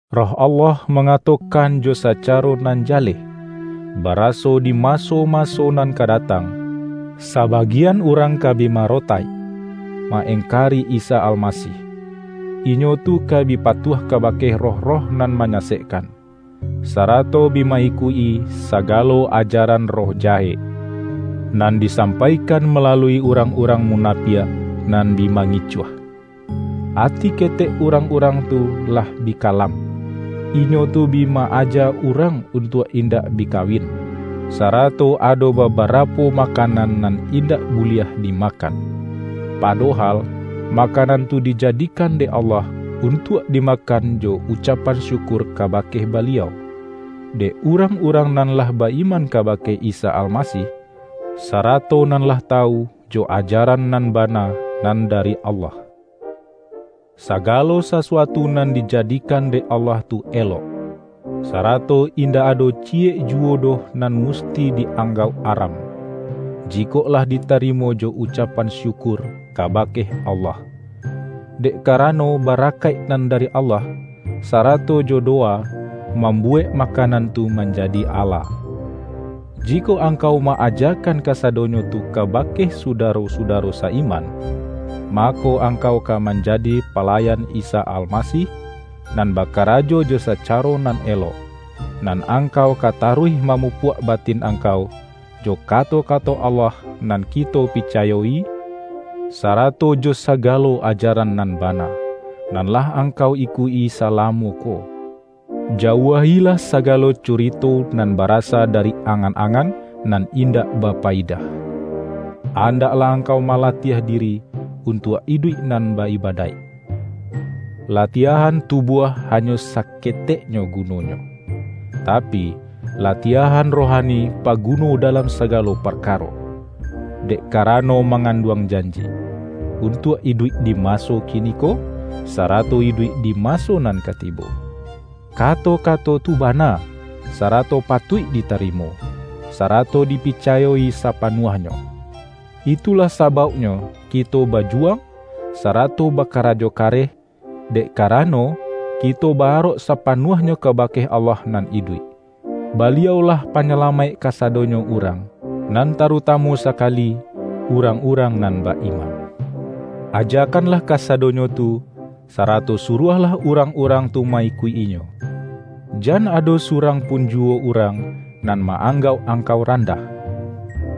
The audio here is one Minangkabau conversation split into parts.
Roh Allah mangatokan jo saca-ro nan jaleh, baraso di maso-ma-so nan ka datang, sabagian urang ka bi marotaik, ma-engkari Isa Almasih. Inyo tu ka bi patuah kabake roh-roh nan ma-nyasekkan, sarato bi ma-ikuik-i saga-lo ajaran roh jahek, nan disampaikan malalui urang-urang munapiak nan bi mangicuah. Ati ketek urang-urang tu lah bi kalam. Inyo tu bi ma-aja urang untuak indak bi kawin, sarato ado ba-barapo makanan nan indak buliah di-makan. Padohal makanan tu dijadikan dek Allah, untuak dimakan jo ucapan syukur kabake Baliau, dek urang-urang nan lah ba-iman kabake Isa Almasih, sarato nan lah tawu jo ajaran nan bana nan dari Allah. Sagalo sasuatu nan di-jadikan dek Allah tu elok, sarato indak ado ciyek juwo doh nan musti di-ang-gauk aram, jikok lah ditarimo jo ucap-an syukur kabake Allah. Dek karano barakaik nan dari Allah, sarato jo do-wa, mambuwek makanan tu manjadi ala. Jikok angkau ma-ajakan kasa-donyo tu kabake sudaro-sudaro sa-iman, mako, angkau ka manjadi pa-layan Isa Almasih nan bakarajo jo sacaro nan elok. Nan angkau ka ta-ruih mamupuak batin angkau, jo kato-kato Allah nan kito picayo-i, sara-to jo sagalo ajaran nan bana, nan lah angkau ikuik-i salamo ko. Jauahilah sagalo curito nan barasa dari angan-angan nan indak bapayidah. Andak-lah angkau malatiah diri untuak iduik nan ba-ibadaik. Latiahan tubuah ha-nyo saketeknyo gunonyo, tapi, latiah-an rohani paguno dalam sagalo par-karo, dek karano manganduang janji, untuak iduik di maso kiniko, sarato iduik di maso nan ka tibo. Kato-ka-to tu bana, sarato patuik ditarimo, sa-rato dipicayo-i sapanuahnyo. Itu-lah sabauknyo kito bajuwang, sarato bakarajo kareh, dek karano, kito ba-arok sapanuahnyo kabake Allah nan iduik; Baliau-lah Panyalamaik kasa-donyo urang, nan tarutamu sakali urang-urang nan ba-iman. Ajakanlah kasadonyo tu, sarato suruahlah urang-urang tu ma-ikuik-inyo. Jan ado surang pun juwo urang nan ma-anggauk angkau ran-dah,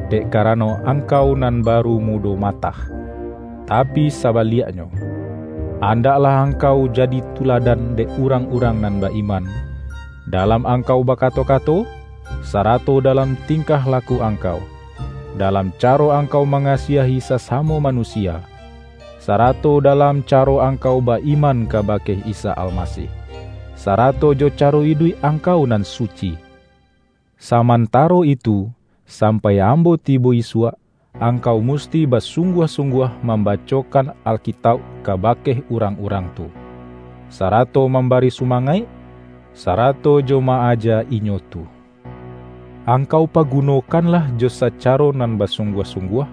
dek karano angkau nan baru mu-do matah. Tapi sabaliaknyo, andaklah angkau jadi tuladan dek urang-urang nan ba-iman, dalam angkau bakato-kato, sarato dalam tingkah laku ang-kau, dalam caro angkau mangasiahi sasamo manusia, sarato dalam caro angkau ba-iman kabake Isa Almasih, sarato jo caro iduik angkau nan su-ci. Samantaro itu, sampai ambo ti-bo isuak, angkau musti basungguah-sungguah mambacokan Alkitauk kabake urang-urang tu, sarato mam-bari sumangaik, sarato jo ma-aja inyo tu. Angkau pagunokanlah jo saca-ro nan basungguah-sungguah,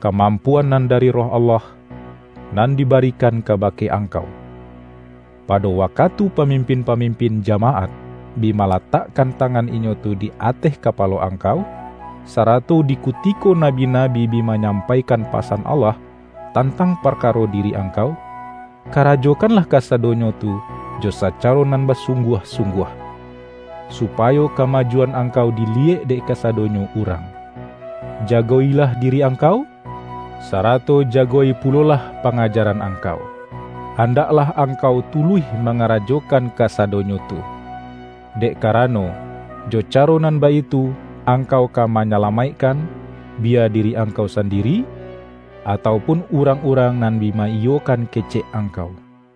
ka-mampuan nan dari Roh Allah nan di-barikan kabake angkau, pado wakatu pamimpin-pamimpin jamaat, bi ma-latakkan tangan inyo tu di ateh ka-palo angkau, sarato di kutiko nabi-nabi bi manyampaikan pasan Allah tantang parkaro diri angkau. Kara-jokanlah kasadonyo tu jo sacaro nan basungguah-sungguah, supayo ka-majuan angkau diliyek dek kasadonyo urang. Jago-ilah diri angkau, sarato jago-i pulolah pangajaran ang-kau. Andaklah angkau tuluih manga-rajokan kasadonyo tu, dek karano, jo caro nan baitu angkau ka manyala-maikkan, biya diri angkau sandiri, atau pun urang-urang nan bi ma-iyo-kan kecek angkau.